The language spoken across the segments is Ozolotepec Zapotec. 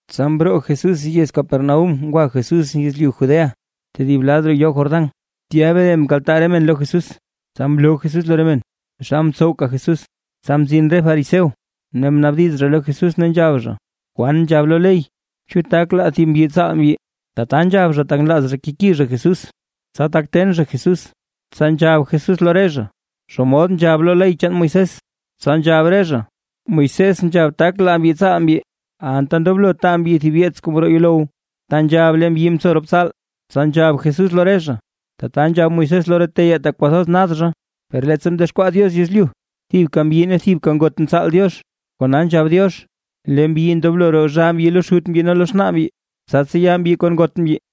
Tsa mroo Jesús yez Capernaúm ngwa Jesús yezlyu Judea, tedib lad roo yoo Jordán, tya mre mkaltaa re men lo Jesús, tsa mloo Jesús lo re men, taxal ntsowka Jesús. Tsa mzin re fariseo, ne mnaabdiz zha lo Jesús, ne nzhab zha: ―¿Kwaan nzhab lo ley? ¿Chu tak laa thib mbyi tsaal mbyi? Tata nzhab zha, tak nlaaz zha keki zha Jesús, tsa tak ten zha Jesús. Tsa nzhab Jesús lo re zha: ―¿Xomod nzhab lo ley chaan Moisés? Tsa nzhab re zha: ―Moisés nzhab, tak laa mbyi tsaal mbyi, anta ndoblo taa mbyi thib yeets kuu mroo yuulow, ta nzhab lee mbyi mtso rop tsaal. Tsa nzhab Jesús lo re zha: ―Tata nzhab Moisés lo re teyaa tak kwathoz nad zha. Per leettsa mdexkwaa Diox yezlyu, thibka mbyi ne thibka ngot mtsaal Diox. Kona nzhab Diox: “Lee mbyi ndoblo roo zhaa mbyi lo xut mbyi ne lo xnaa mbyi, tsa tseya mbyi kon ngot mbyi,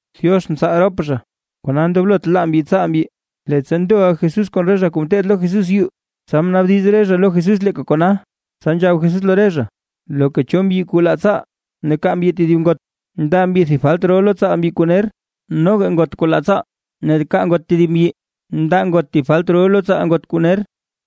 Diox mtsaal rop zha, kona ndoblot laa mbyi tsaal mbyi. Leettsa ndoʼa Jesús kon re zha kuu ngeteed lo Jesús yuu, tsa mnaabdiz re zha lo Jesús leeka kona. Tsa nzhab Jesús lo re zha: ―Loka cho mbyi kuu laa tsaal, ne kaa mbyi tedib ngot, ndaa mbyi thib falt ro lo tsaal mbyi kuu ner, noga ngot kuu laa tsaal, ne kaa ngot tedib mbyi, ndaa ngot thib falt ro lo tsaal ngot kuu ner.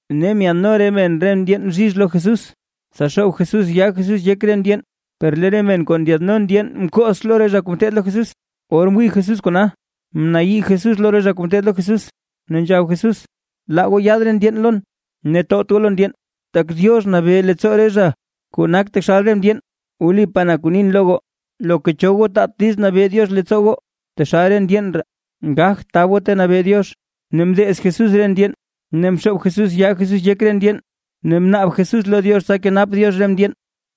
Ne myaadno re men re ndyeen bzhizh lo Jesús, tsa xoob Jesús yaa Jesús yek re ndyeen, per lee re men kuu ndyaadno ndyeen mkox lo re zha kuu ngeteed lo Jesús. Or mwii Jesús kona, mnayii Jesús lo re zha kuu ngeteed lo Jesús, ne nzhab Jesús: ―Laa goo yaad re ndyeen lon, ne towt goo lo ndyeen, tak Diox nabee leettsoo re zha kuu nak taxal re ndyeen. Wlipaa na kuu nin lo goo, loka cho goo taat diiz nabee Diox leettsoo goo, taxal re ndyeen ree, gagt tab goo ta nabee Diox. Ne mdeez Jesús re ndyeen, ne mxoob Jesús yaa Jesús yek re ndyeen, ne mnaab Jesús lo Diox tsa kenap Diox re ndyeen.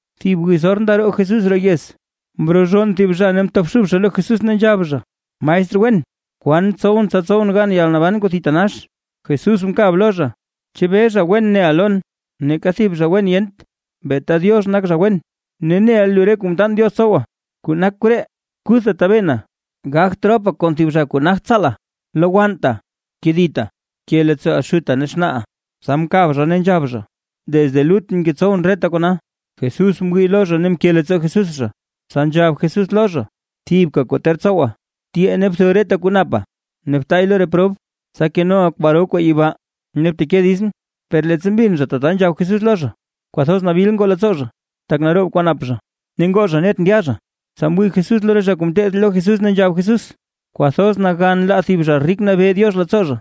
Thib wiz or ndaroo Jesús roo yez, mrozhonn thib zha ne mtobxub zha lo Jesús, ne nzhab zha: ―Maestr wen, ¿kwan tsowʼn tsa tsowʼn gan yalnaban kuu thitanax? Jesús mkab lo zha: ―¿Chebee, zha wen neʼa lon? Neeka thib zha wen yent, beeta Diox nak zha wen. Ne, neʼa lu re kuu mtaan Diox tsowa. Kuu nak re koree: Kuthta tabena, gagt ropa kon thib zha kuu nagt tsaala, lowannta, kedita, bke leettsooʼa xuta ne xnaaʼa. Tsa mkab zha ne nzhab zha: ―Desde lutʼn ngetsowʼn reta kona. Jesús mwii lo zha ne mke leettsoo Jesús zha, tsa nzhab Jesús lo zha: ―Thibka kuu ter tsowa, tyee ne btho reta kuu napa ne btaay lo re prob, tsa kenoʼa kwaro kwaa yibaa, ne bteke ditsʼn. Per leettsa mbin zha tata nzhab Jesús lo zha, kwathoz nabil ngoo leettsoo zha, tak naroob kwaa nap zha, ne ngoo zha net ndya zha. Tsa mwii Jesús lo re zha kuu ngeteed lo Jesús, ne nzhab Jesús: ―Kwathoz nagan laa thib zha rik nabee Diox leettsoo zha.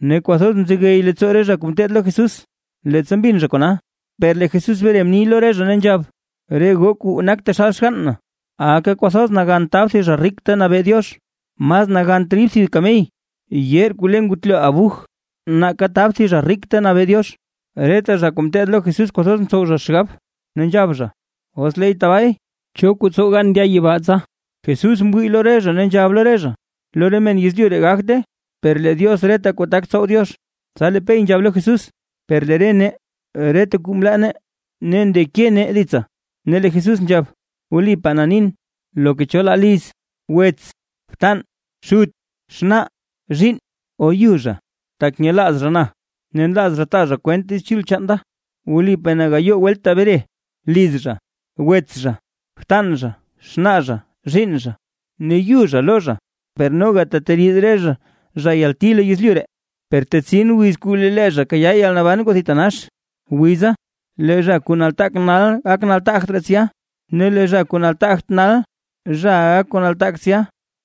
Ne kwathoz mzegey leettsoo re zha kuu ngeteed lo Jesús, leettsa mbin zha kona, per lee Jesús mre mni lo re zha, ne nzhab: ―Re goo kuu nak taxal Xgann na, aka kwathoz nagan tab thib zha rik ta nabee Diox. Mas nagant rid thib kamey yeer kuu le ngutlo abuj, nake tab thib zha rik ta nabee Diox. Reta zha kuu ngeteed lo Jesús kwathoz ntsow zha xgab, ne nzhab zha: ―Os leey tabaay, ¿cho kuu tsow gan ndya yibaa tsa? Jesús mwii lo re zha, ne nzhab lo re zha: ―Lo re men yezlyu ree gagte, per lee Diox reta kuu tak tsow Diox. Tsa lee Pey nzhab lo Jesús: ―Per lee re nee, reta kuu mlaa nee, ne ndeke nee ditsa. Ne lee Jesús nzhab: ―Wlipaa na nin, loka cho zha laa liz, wets, btan, xut, xnaa, zhiinn, o yu zha, tak nyelaaz zha na ne nlaaz zha taa zha kwent Diiz Chul chaan da, wlipaa na gayoo welt tebre, liz zha, wets zha, btan zha, xnaa zha, zhiinn zha, ne yu zha lo zha, per noga teteriid re zha zha yalti lo yezlyu ree, per tetsin wiz kuu lee zha kayaa yalnaban kuu thitanax. Wiza lee zha kuu nataak nal gak zha kuu nataagt raa tsya, ne lee zha kuu nataagt nal zhaʼa gak zha kuu nataak tsya.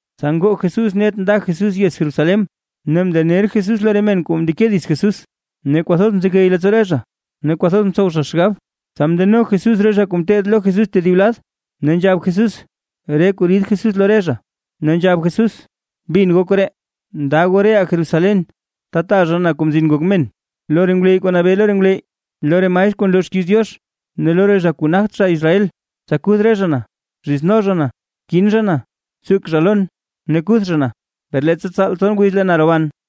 Tsa ngoo Jesús net nda Jesús yez Jerusalén, ne mndener Jesús lo re men kuu ndeke dits Jesús, ne kwathoz mzegey leettsoo re zha, ne kwathoz ntsow zha xgab. Tsa mndeno Jesús re zha kuu ngeteed lo Jesús tedib lad, ne nzhab Jesús re kuu rid Jesús lo re zha. Ne nzhab Jesús: ―Bin goo koree. Nda goo reʼaa Jerusalén ta taa zha na Kuu Mtaal Diox Ngok Men, lo re ngwleyy kuu nabee lo re ngwleyy, lo re maestr kuu nloo xkiiz Diox, ne lo re zha kuu nagt zha Israel, tsa kuth re zha na. Zhizno zha na, kin zha na, tsuk zha lon ne kuth zha na, per leettsa tsaal tson wiz lee na roban.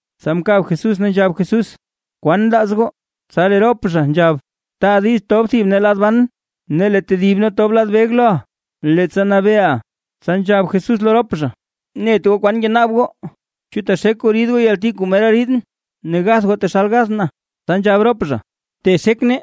Tsa mkab Jesús ne nzhab Jesús: ―¿Kwan nlaaz goo? Tsa lee rop zha nzhab: ―Taa diiz tob thib nee lad ban ne lee tedib nee tob lad beg loʼa, leettsa nabeeʼa. Tsa nzhab Jesús lo rop zha: ―Net goo kwan ngenaab goo. ¿Chu texek goo rid goo yalti kuu mera riidʼn, ne gath goo taxal gathʼn? Tsa nzhab rop zha: ―Texek nee.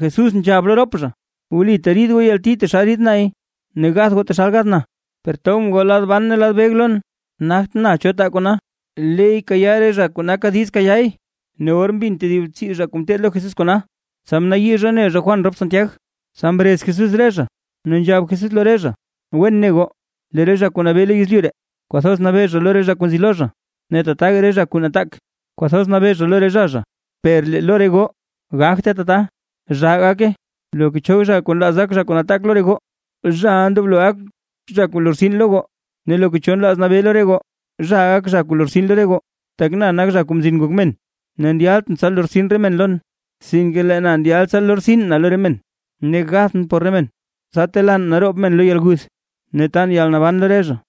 Jesús nzhab lo rop zha: ―Wli teriid goo yalti taxal rid nay ne gath goo taxal gathʼn. Per tobʼn goo lad ban ne lad beg lon, nagt na cho taa kona. Leey kayaa re zha kuu naka diiz kayaay. Ne or mbin tedib tsii zha kuu ngeteed lo Jesús kona, tsa mnayii zha mne zha Juan rop Santiag. Tsa mrez Jesús re zha, ne nzhab Jesús lo re zha: ―Wen ne goo, lee re zha kuu nabee lo yezlyu ree, kwathoz nabee zha lo re zha kuu nzi lo zha, ne tataga re zha kuu nataak kwathoz nabee zha lo re zha zha. Per lee lo re goo, gagte tata, zhaa gake, loka cho nlaaz gak zha kuu nataak lo re goo, zhaʼa ndoblo gak zha kuu lortsin lo goo. Ne loka cho nlaaz nabee lo re goo, zhaʼa gak zha kuu lortsin lo re goo. Tak na nak Zha Kuu Mzin Ngok Men, ne ndyaltʼn tsa lortsin re men lon, sinke lee na ndyalʼn tsa lortsin na lo re men, ne gathʼn por re men, tsa telaan naroob men lo yalguth, ne tan yalnaban lo re zha.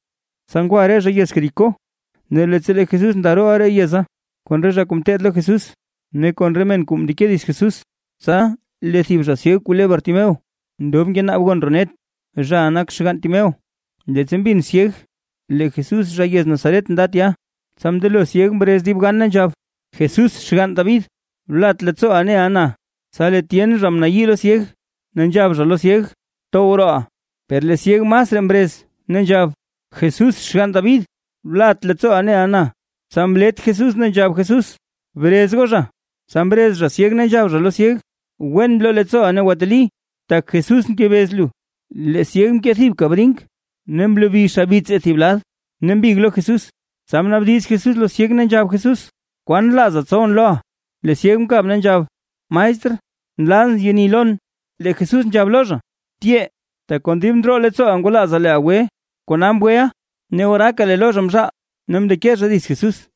Tsa ngwa re zha yez Jericó, ne leettsa lee Jesús ndarooʼa roo yeza kon re zha kuu ngeteed lo Jesús, ne kon re men kuu mndeke dits Jesús. Tsa lee thib zha syeg kuu le Bartimeo ndob ngenaab gon roo net, zhaʼa nak xgann Timeo. Leettsa mbin syeg lee Jesús zha yez Nazaret nda tya, tsa mndelo syeg mrez dib gan ne nzhab: ―Jesús xgann David, blat leettsooʼa neʼa na. Tsa lee tyen zha mnayii lo syeg, ne nzhab zha lo syeg: ―¡Tow rooʼa! Per lee syeg masraa mrez, ne nzhab: ―Jesús xgann David, blat leettsooʼa neʼa na. Tsa mlet Jesús ne nzhab Jesús: ―Brez goo zha. Tsa mrez zha syeg ne nzhab zha lo syeg: ―Wen bloo leettsooʼa ne gwateli, tak lee Jesús ngebez lu. Lee syeg mkee thibka brink ne mlobi xabits thib lad ne mbig lo Jesús. Tsa mnaabdiz Jesús lo syeg, ne nzhab Jesús: ―¿Kwaan nlaaza tsowʼn loʼa? Lee syeg mkab ne nzhab: ―Maestr, nlazʼn yeni lon. Lee Jesús nzhab lo zha: ―Tyee, tak kon dib ndroo leettsooʼa ngwalaaza leeʼa gwe, kona mgweʼa. Ne oraaka lee lo zha mzhaal, ne mndeke zha dits Jesús.